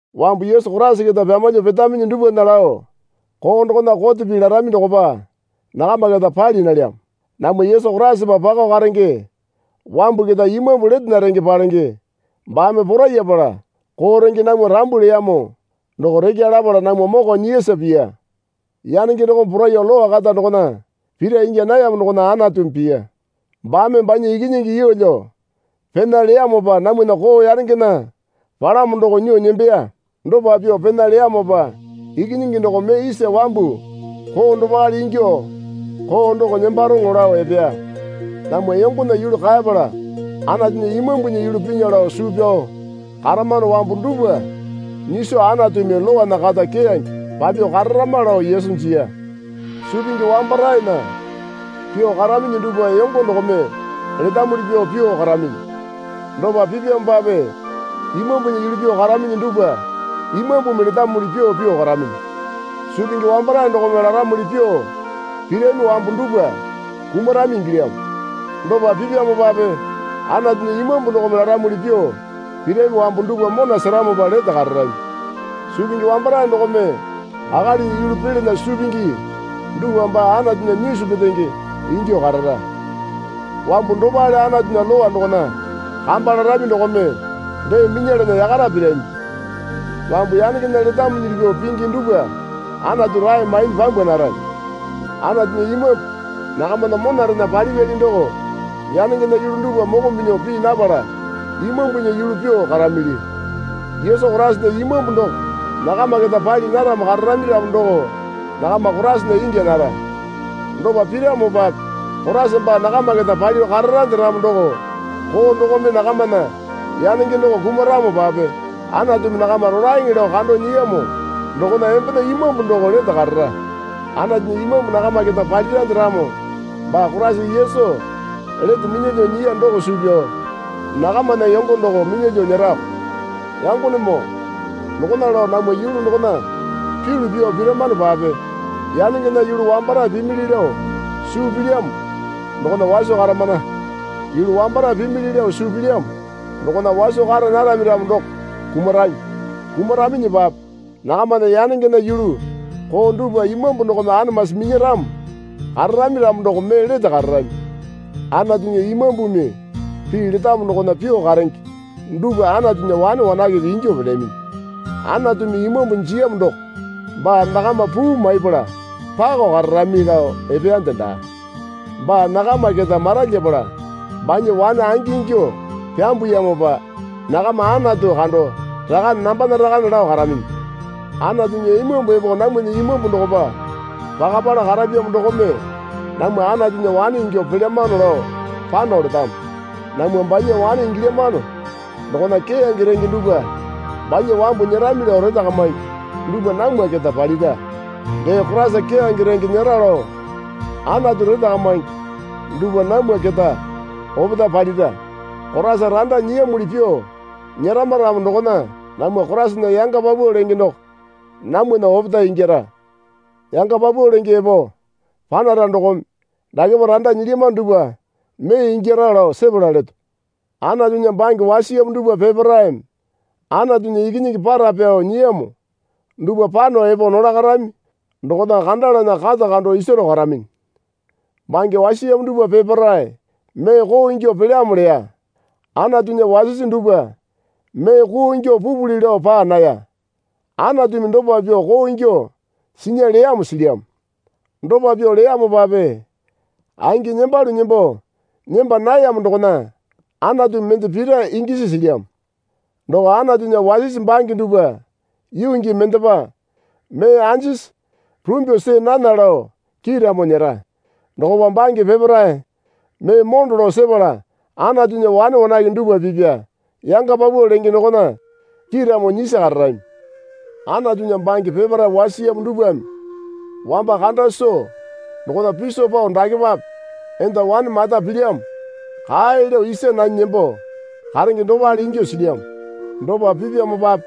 Wambu Yesu Koraisa keta pyamalyuo petaminyi dupwana lao koo dokona kote pii larami dokopa nakama keta pali nalyamo. Namwa Yesu Koraisapa pakao karenge wambu keta Imambu letena renge palenge baame porayapala koo renge namwa rambu leyamo doko rekya lapala namwa moko nyiyasa piya. Yanenge dokome poraiyuo Lowa kata dokona pira ingya nayamo dokona Anatumi piya. Baame banya Ikinyingi yeelyo pena leyamopa namwana koo yanengena palamo doko nyuo nembeya. Dopa pyuo pena leyamopa Ikinyingi doko mee isa wambu koo dopale ingyuo koo doko nembaroŋo lao epeya. Namwa yongona yulu kaepala Anatunya Imambunya yulu pinya lao suu pyao karamano wambu dupwa nyiso Anatumi Lowana kata keyange papyuo kararama lao Yesu jiya. Suu pingi wambaraena pyuo karaminyi dupwa yongo dokome letamuli pyuo pyuo karaminyi. Dopa pipyamopape Imambunya yulu pyuo karaminyi dupwa Imambumi letamuli pyuo pyuo karaminyi. Suu pingi wambarae dokome laramuli pyuo pirami wambu dupwa kumarami ingilyamo. Dopa pipyamopape Anatunya Imambu dokome laramuli pyuo pirami wambu dupwa mona seramopa lete kararami. Suu pingi wambarae dokome akalinya yulu pilana suu pingi dupwa baa Anatunya nyisu petenge ingyuo karara. Wambu dopale Anatunya lowa dokona kamba larami dokome dee minyalana yakara pirami. Wambu yanengena letamuli pyuo pingi dupwa Anatu rae mainyi pyambwa narami. Anatunya Imambu nakamana monarena palipyali doko yanengena yulu dupwa moko minyuo pii napala Imambunya yulu pyuo karamili. Yesu Koraisana Imambu doko nakama keta pali naramo kararami ramo doko nakama Koraisana ingya nara. Dopa piramopape Koraisa baa nakama keta palyuo kararande ramo doko koo dokome nakamana yanenge doko kumaramopape Anatumi nakama rolaeŋe lao kando nyiyamo dokona embena imambu doko lete karara. Anatunya Imambu nakama keta palirande ramo baa Koraisa Yesu lete minyalyuo nyiya doko suu pyao nakamana yongo doko minyalyuo nyerako. Yangonemoo dokona lao namwa yulu dokona pyulu pyuo piramanopape yanengena yulu wambarae pimili lao suu pilyamo dokona waso karamana. Yulu wambarae pimili lao suu pilyamo dokona waso kara narami ramo doko kumarami. Kumaraminyipape nakamana yanengena yulu koo dupwa Imambu dokome anamasi minyaramo kararami ramo doko mee lete kararami. Anatunya Imambumi pii letamo dokona pyuo karenge dupwa Anatunya wane wanakepe ingyuo pelyaminyi. Anatumi Imambu jiyamo doko baa nakama puu maipala pako kararami lao epeyande daa. Baa nakama keta maralyapala banya wane angingyuo pyambuyamopa nakama Anatu kando Rakane, nambana Rakane lao karaminyi. Anatunya Imambu epo namwana imambu dokopa pakapala karapyamo dokome namwa Anatunya wane ingyuo pelyamano lao pano letamo. Namwa banya wane ingilyamano dokona keyange renge dupwa banya wambu nyerami lao retakamingi dupwa namwa keta palira. Dee Koraisa keyange renge nyera lao Anatu retakamingi dupwa namwa keta opetae palira. Koraisa randa nyiyamuli pyuo nyerama ramo dokona namwa Koraisana yanga paupau lenge doko namwana opetae ingyara. Yanga paupau lenge epo panara dokome dakepa randa nyilyamano dupwa mee ingyara lao sepala leto. Anatunya bange wasiyamo dupwa peparaeme Anatunya ikinyingi para pyao nyiyamo dupwa pano epo nolakarami dokona kandalana kata kando isaro karaminyi. Bange wasiyamo dupwa peparae mee koo ingyuo pelyamo leya. Anatunya wasisi dupwa mee koo ingyuo pupuli lao paa naya. Anatumi dopa pyuo koo ingyuo sinya leyamo silyamo. Dopa pyuo leyamopape angi nembalu nembo nemba nayamo dokona Anatumi mende pira ingyasi silyamo. Doko Anatunya wasisi bange dupwa yuu gii mendepa mee anjisi rumbyuo see nana lao kiiramo nyera. Dokopa bange peparae mee mondo lao sepala Anatunya wane wanake dupwa pipya yanga paupau lenge dokona kiiramo nyisi kararami. Anatunya bange peparae wasiyamo dupwame wamba kanda soo dokona piso pao dakepape enda wane mata pilyamo kae lao isa nanyi nembo karenge dopale ingyuo silyamo. Dopa pipyamopape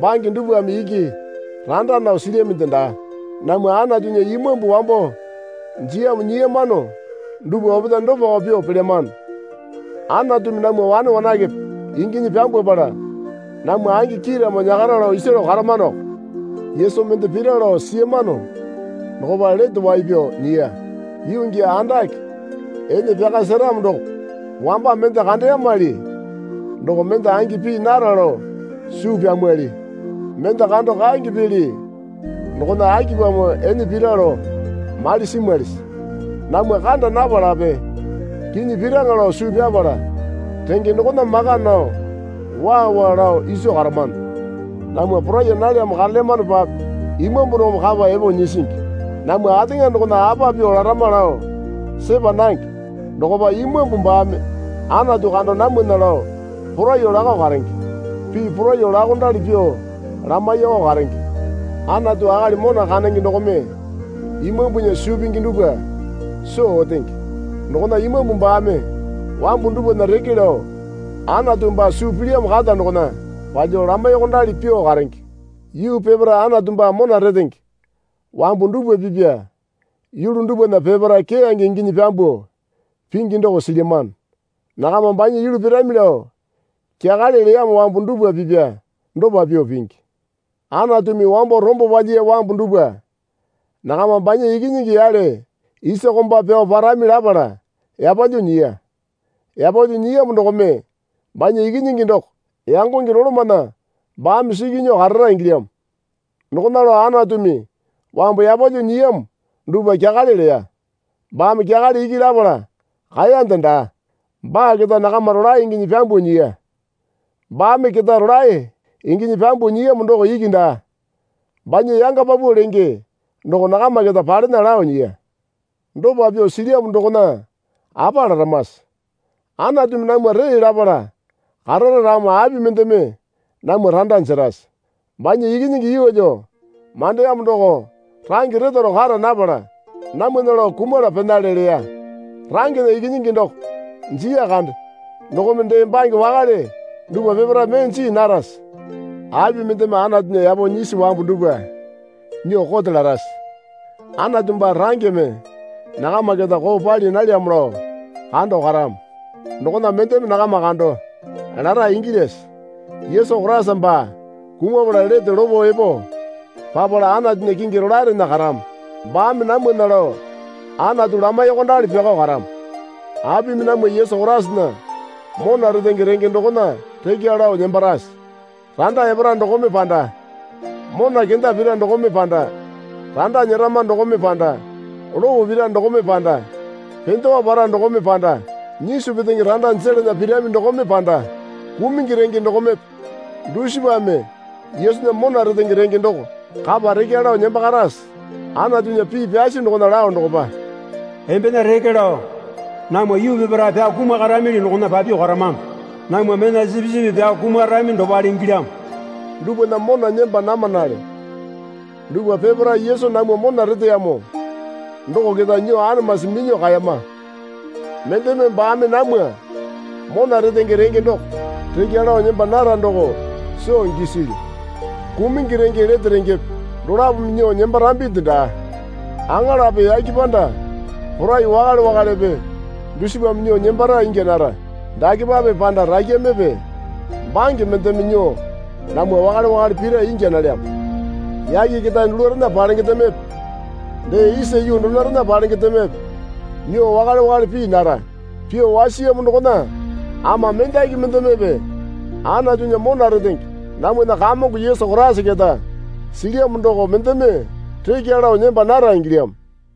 bange dupwame iki randa nao silyaminde daa. Namwa Anatunya Imambu wambo jiyamo nyiyamano dupwa opetae dopako pyuo pelyamano. Anatumi namwa wane wanakepe inginyi pyambwapala namwa angi kiiramo nyakara lao isaro karamanoko. Yesu mende pira lao siyamano dokopa lete wai pyao nyiya. Yuu gii andake ene pyaka seramo doko wamba mende kandeyamali doko mende angi pii nara lao suu pyamwali. Mende kando kaenge pili dokona akipamo ene pira lao mali simwalisi? Namwa kanda napalape kinyi piraŋa lao suu pyapala renge dokona maka nao waa waa lao iso karamano. Namwa poraiya nalyamo karelyamanopape Imambu dokome kapa epo nyisingi. Namwa ateŋa dokona apa pyuo larama lao sepa nange. Dokopa Imambu baame Anatu kando namwana lao poraiyuo lakao karenge. Pii poraiyuo laokondali pyuo lamaiyakao karenge. Anatu akali mona kandenge dokome Imambunya suu pingi dupwa soo otenge. Dokona Imambu baame wambu dupwana reke lao Anatu baa suu pilyamo kata dokona palyuo lamaiyuokondali pyuo karenge. Yuu peparae Anatu baa mona retenge wambu dupwa pipya yulu dupwana peparae keyange inginyi pyambuo pingi doko silyamano. Nakama banya yulu pirami lao kyakale leyamo wambu dupwa pipya dopa pyuo pingi. Anatumi wambo rombo palyiya wambu dupwa nakama banya Ikinyingi yale isa komba pyao parami lapala yapalyuo nyiya. Yapalyuo nyiyamo dokome banya Ikinyingi doko yangonge dolomana baame siki nyuo karara ingilyamo. Dokona lao Anatumi wambu yapalyuo nyiyamo dupwa kyakale leya. Baame kyakale iki lapala kaeyande daa. Baa keta nakama rolae inginyi pyambuo nyiya. Baame keta rolae inginyi pyambuo nyiyamo doko iki daa. Banya yanga paupau lenge doko nakama keta palena lao nyiya. Dopa pyuo silyamo dokona apa laramase? Anatumi namwa tee lapala karara ramo api mendeme namwa randa jerase? Banya Ikinyingi yeelyo mandeyamo doko range retaro kara napala namwana lao kumala penale leya. Rangena Ikinyingi doko jiya kande. Dokome dee bange wakale dupwa peparae mee jii narase? Api mendeme Anatunya yapo nyisi wambu dupwa nyuo kote larase? Anatu baa rangeme nakama keta koo pali nalyamo lao kando karamo. Dokona mendeme nakama kando lara ingilyase? Yesu Koraisa baa kumapala lete lopo epo papala Anatunya kingi rolaerena karamo. Baame namwana lao Anatu lamaiyuokondali pyako karamo. Apimi namwa Yesu Koraisana mona retenge renge dokona rekya lao nembarase? Randa epara dokome panda mona kenda pira dokome panda randa nyerama dokome panda lopo pira dokome panda pendewa para dokome panda nyisu petenge randa jelana pirami dokome panda kumungi renge dokomepe dusipame Yesunya mona retenge renge doko kapa rekya lao nembakarase? Anatunya pii pyasi dokona lao dokopa, Embena reke lao namwa yuu peparae pyao kumakaramili dokona papyuo karamano. Namwa mena sipisipi pyao kumarami dopale ingilyamo. Dupwana mona nemba namanale. Dupwa peparae Yesu namwa mona reteyamo doko keta nyuo anamasi minyuo kaeyama. Mendeme baame namwa mona retenge renge doko rekya lao nemba nara doko soo gisilyu. Kumungi renge lete rengepe dolapome nyuo nembarambinde daa. Aŋalape yake panda porai wakale wakalepe dusipame nyuo nembara ingya nara. Dakepape panda rakyamepe bange mendeme nyuo namwa wakale wakale pira ingya nalyamo. Yake ketae dulurena palengendemepe dee isa yuu donorena palengendemepe nyuo wakale wakale pii nara. Pyuo wasiyamo dokona ama mendaki mendemepe Anatunya mona retenge namwana Kamongo Yesu Koraisa keta silyamo doko mendeme rekya lao nemba nara ingilyamo.